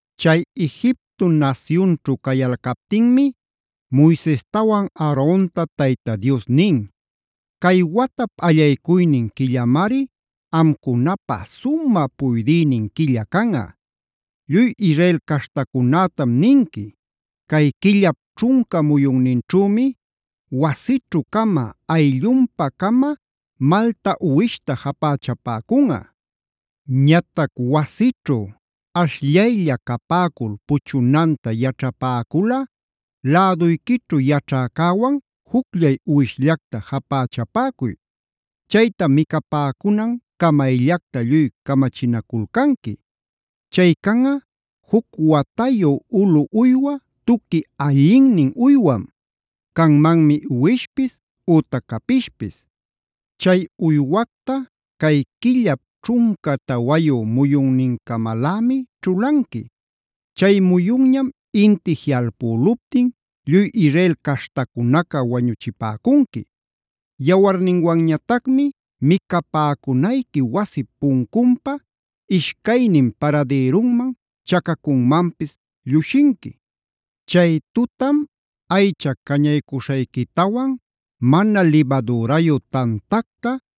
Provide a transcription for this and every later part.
Chay Egipto nasyunćhu cayalcaptinmi Moisestawan Aaronta Tayta Dios nin: “Cay watap allaycuynin quillamari amcunapä sumä puydïnin quilla canꞌa. Lluy Israel caśhtacunätam ninqui: Cay quillap ćhunca muyunninćhümi wasićhu-cama, ayllunpa-cama malta uwishta japächapäcunꞌa. Ñatac wasićhu ashllaylla capäcul puchunanta yaćhapäculꞌa, läduyquićhu yaćhäcäwan jucllay uwishllacta japächapäcuy. Chayta micapäcunan camayllacta lluy camachinaculcanqui. Chay canꞌa, juc watayu ulu uywa tuqui allinnin uywam; canmanmi uwishpis ütac capishpis. Chay uywacta cay quillap ćhunca tawayu muyunnincamalämi ćhulanqui. Chay muyunñam inti jiꞌalpüluptin lluy Israel caśhtacunaca wañuchipäcunqui. Yawarninwanñatacmi micapäcunayqui wasip puncunpa ishcaynin paradïrunman, chacacunmanpis llushinqui. Chay tutam aycha cañaycuśhayquitawan, mana libadürayu tantacta,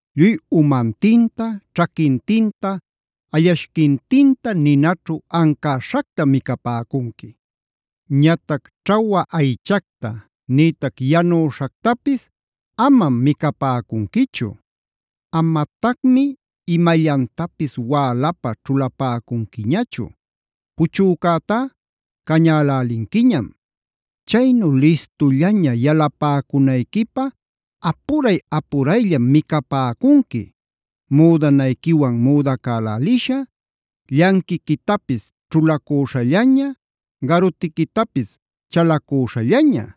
Lluy umantinta, ćhaquintinta, allashquintinta ninaćhu ancäśhactam micapäcunqui. Ñatac ćhawa aychacta, nïtac yanüśhactapis amam micapäcunquichu. Amatacmi imallantapis wälapä ćhulapäcunquiñachu; puchücätá cañälälinquiñam. Chaynu listullaña yalapäcunayquipä apuray-apurayllam micapäcunqui: Müdanayquiwan müdacälälisha, llanquiquitapis ćhulacüśhallaña, garutiquitapis chalacüśhallaña.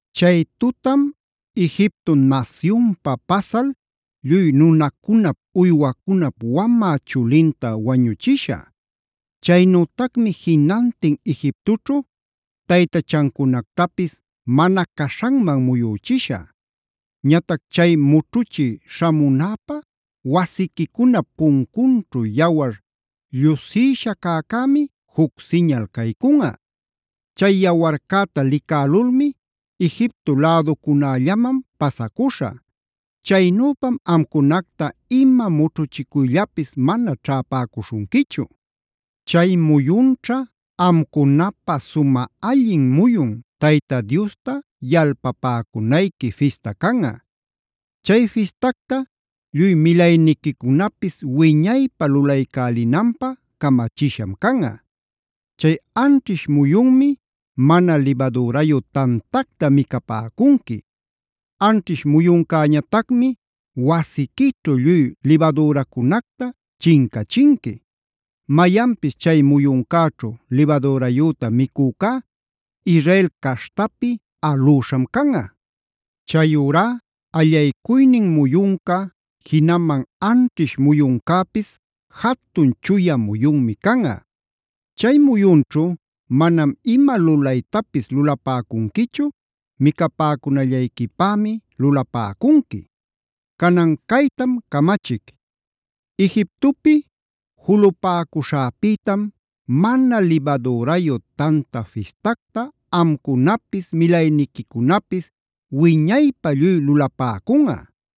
Chay tutam Egipto nasyunpa pasal lluy nunacunap, uywacunap wamä chulinta wañuchishä. Chaynütacmi jinantin Egiptoćhu taytachancunactapis mana caśhanman muyüchishä. “Ñatac chay mućhuchï śhamunäpä wasiquicunap puncunćhu yawar llushïsha cäcämi juc siñal caycunꞌa. Chay yawarcäta licälulmi Egipto läducunällaman pasacuśhä. Chaynüpam amcunacta ima mućhuchicuyllapis mana ćhäpäcuśhunquichu. “Chay muyunćha amcunapä sumä allin muyun Tayta Diosta yalpapäcunayqui fista canꞌa. Chay fistacta lluy milayniquicunapis wiñaypä lulaycälinanpä camachisham canꞌa. Chay anćhish muyunmi mana libadürayu tantacta micapäcunqui. Anćhish muyuncäñatacmi wasiquićhu lluy libadüracunacta chincachinqui. Mayanpis chay muyuncäćhu libadürayüta micücá Israel caśhtapi alüśham canꞌa. Chayurá allaycuynin muyunca, jinaman anćhish muyuncäpis jatun chuya muyunmi canꞌa. Chay muyunćhu manam ima lulaytapis lulapäcunquichu; micapäcunallayquipämi lulapäcunqui. “Canan caytam camachic: Egiptopi julupäcuśhäpïtam, Mana Libadürayu Tanta Fistactac amcunapis, milayniquicunapis wiñaypä lluy lulapäcunꞌa.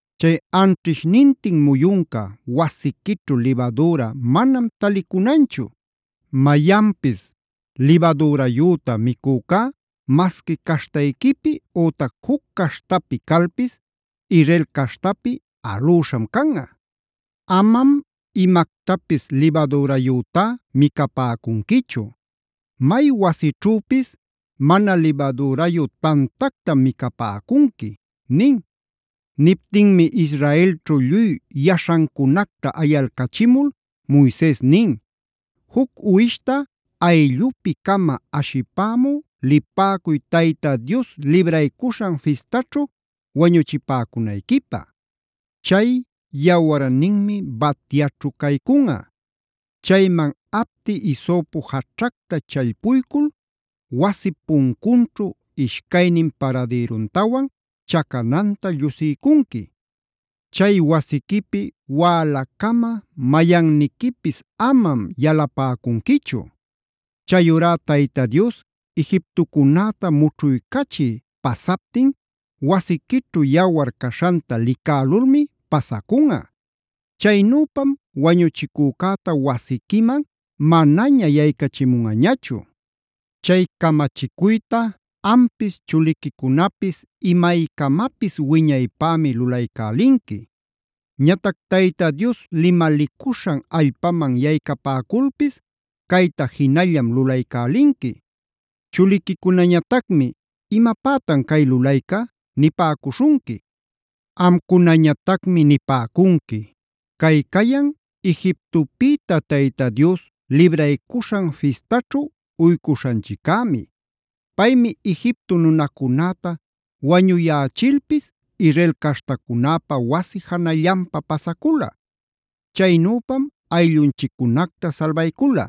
Chay anćhishnintin muyunca wasiquićhu libadüra manam talicunanchu. Mayanpis libadürayüta micücá masqui caśhtayquipi ütac juc caśhtapi calpis Israel caśhtapi alüśham canꞌa. Amam imactapis libadürayütá micapäcunquichu. May wasićhüpis mana libadürayu tantactam micapäcunqui” nin. Niptinmi Israelćhu lluy yaśhancunacta ayalcachimul Moises nin: “Juc uwishta ayllupi-cama ashipämü lipäcuy Tayta Dios Libraycuśhan Fistaćhu wañuchipäcunayquipä. Chay yawarninmi batyaćhu caycunꞌa. Chayman apti hisopo jaćhacta challpuycul wasip puncunćhu ishcaynin paradïruntawan chacananta llushiycunqui. Chay wasiquipi wälacama mayanniquipis amam yalapäcunquichu. Chayurá Tayta Dios Egiptocunäta mućhuycachï pasaptin wasiquićhu yawar caśhanta licälulmi pasacunꞌa. Chaynüpam wañuchicücäta wasiquiman manaña yaycachimunꞌañachu. “Chay camachicuyta ampis, chuliquicunapis imaycamapis wiñaypämi lulaycälinqui. Ñatac Tayta Dios limalicuśhan allpaman yaycapäculpis cayta jinallam lulaycälinqui. Chuliquicunañatacmi: ‘¿Imapätan cay lulayca?’ nipäcuśhunqui. Amcunañatacmi nipäcunqui: ‘Cay cayan Egiptopïta Tayta Dios Libraycuśhan Fistaćhu uycuśhanchiccämi. Paymi Egipto nunacunäta wañuyächilpis Israel caśhtacunäpa wasi janallanpa pasacula. Chaynüpam ayllunchiccunacta salbaycula’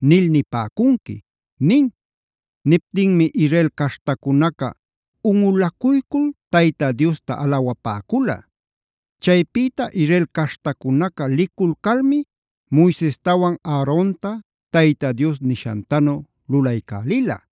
nil nipäcunqui” nin. Niptinmi Israel caśhtacunaca unꞌulacuycul Tayta Diosta alawapäcula. Chaypïta Israel caśhtacunaca liculcalmi Moisestawan Aaronta Tayta Dios nishantanu lulaycälila.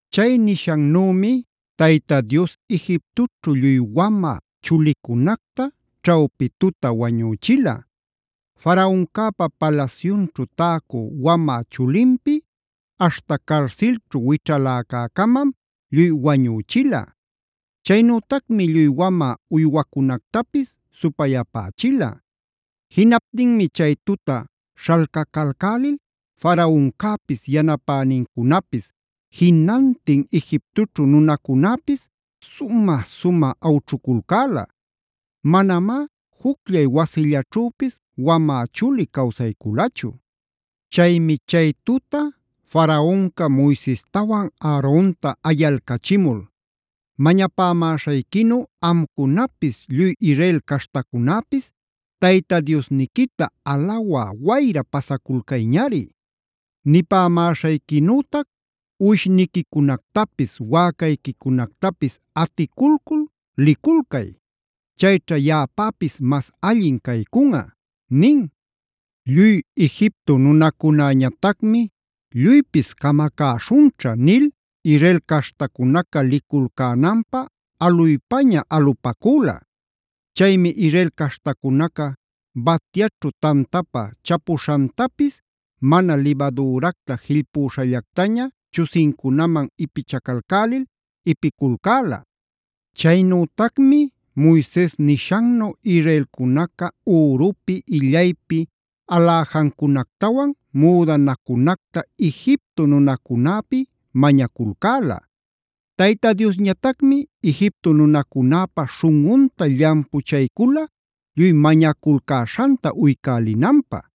Chay nishannümi Tayta Dios Egiptoćhu lluy wamä chulicunacta ćhawpi tuta wañüchila.d Faraoncäpa palasyunćhu täcü wamä chulinpi aśhta carsilćhu wićhalacä-camam lluy wañüchila. Chaynütacmi lluy wamä uywacunactapis supayapächila. Jinaptinmi chay tuta śhalcacalcälil Faraoncäpis, yanapänincunapis, jinantin Egiptoćhu nunacunäpis sumä-sumä awćhuculcäla. Manamá jucllay wasillaćhüpis wamä chuli cawsayculachu. Chaymi chay tuta Faraonca Moisestawan Aaronta ayalcachimul: “Mañapämäśhayquinu amcunapis lluy Israel caśhtacunäpis Tayta Diosniquita alawä wayra pasaculcayñari. Nipämäśhayquinütac uwishniquicunactapis, wäcayquicunactapis aticulcul liculcay. Chayćha yaꞌapäpis mas allin caycunꞌa” nin. Lluy Egipto nunacunäñatacmi “lluypis camacäśhunćha” nil Israel caśhtacunaca liculcänanpä aluypaña-alupäcula. Chaymi Israel caśhtacunaca batyaćhu tantapä chapuśhantapis mana libadüracta jillpüśhallactaña chusincunaman ipichacalcälil ipiculcäla. Chaynütacmi Moises nishannu israelcunaca ürupi, illaypi aläjacunactawan müdanacunacta Egipto nunacunäpi mañaculcäla. Tayta Diosñatacmi Egipto nunacunäpa śhunꞌunta llampuchaycula lluy mañaculcäśhanta uycälinanpä.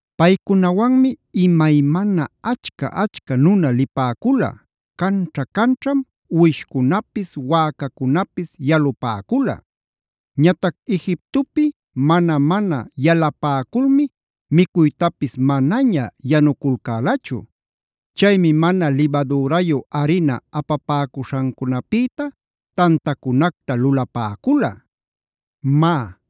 Paycunawanmi imaymana achca-achca nuna lipäcula; canćha-canćham uwishcunapis, wäcacunapis yalupäcula. Ñatac Egiptopi mana-mana yalapäculmi micuytapis manaña yanuculcälachu. Chaymi mana libadürayu arina apapäcuśhancunapïta tantacunacta lulapäcula. Má,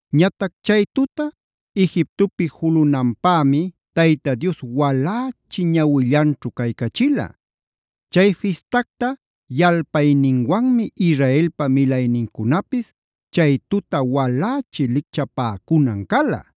Ñatac chay tuta Egiptopi julunanpämi Tayta Dios walächi ñawillanćhu caycachila. Chay fistacta yalpayninwanmi Israelpa milaynincunapis chay tuta walächi lichcapäcunan cala.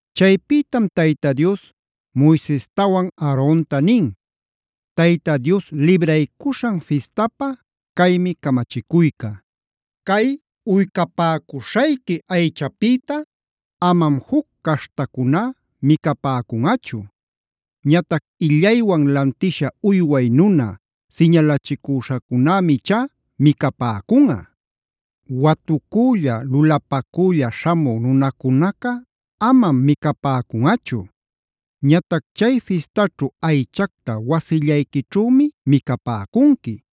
Chaypïtam Tayta Dios Moisestawan Aaronta nin: “Tayta Dios Libraycuśhan Fistapä caymi camachicuyca: Cay uycapäcuśhayqui aychapïta amam juc caśhtacuná micapäcunꞌachu. Ñatac illaywan lantisha uyway nuna siñalachicüśhacunämi ichá micapäcunꞌa. Watucülla, lulapacülla śhamü nunacunaca amam micapäcunꞌachu. Ñatac chay fistaćhu aychacta wasillayquićhümi micapäcunqui.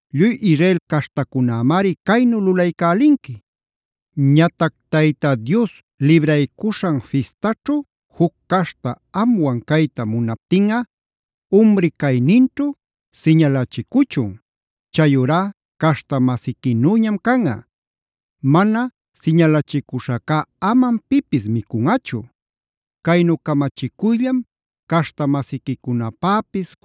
Lluy Israel caśhtacunämari caynu lulaycälinqui. Ñatac Tayta Dios Libraycuśhan Fistaćhu juc caśhta amwan cayta munaptinꞌa, umri cayninćhu siñalachicuchun. Chayurá caśhta-masiquinüñam canꞌa. Mana siñalachicüśhacá amam pipis micunꞌachu. Caynu camachicuyllam caśhta-masiquicunapäpis,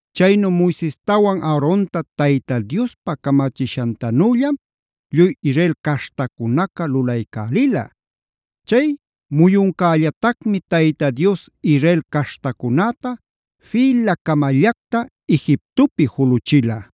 Chaynu Moisestawan Aaronta Tayta Diospa camachishantanüllam lluy Israel caśhtacunaca lulaycälila. Chay muyuncällatacmi Tayta Dios Israel caśhtacunäta fïla-camallacta Egiptopi juluchila.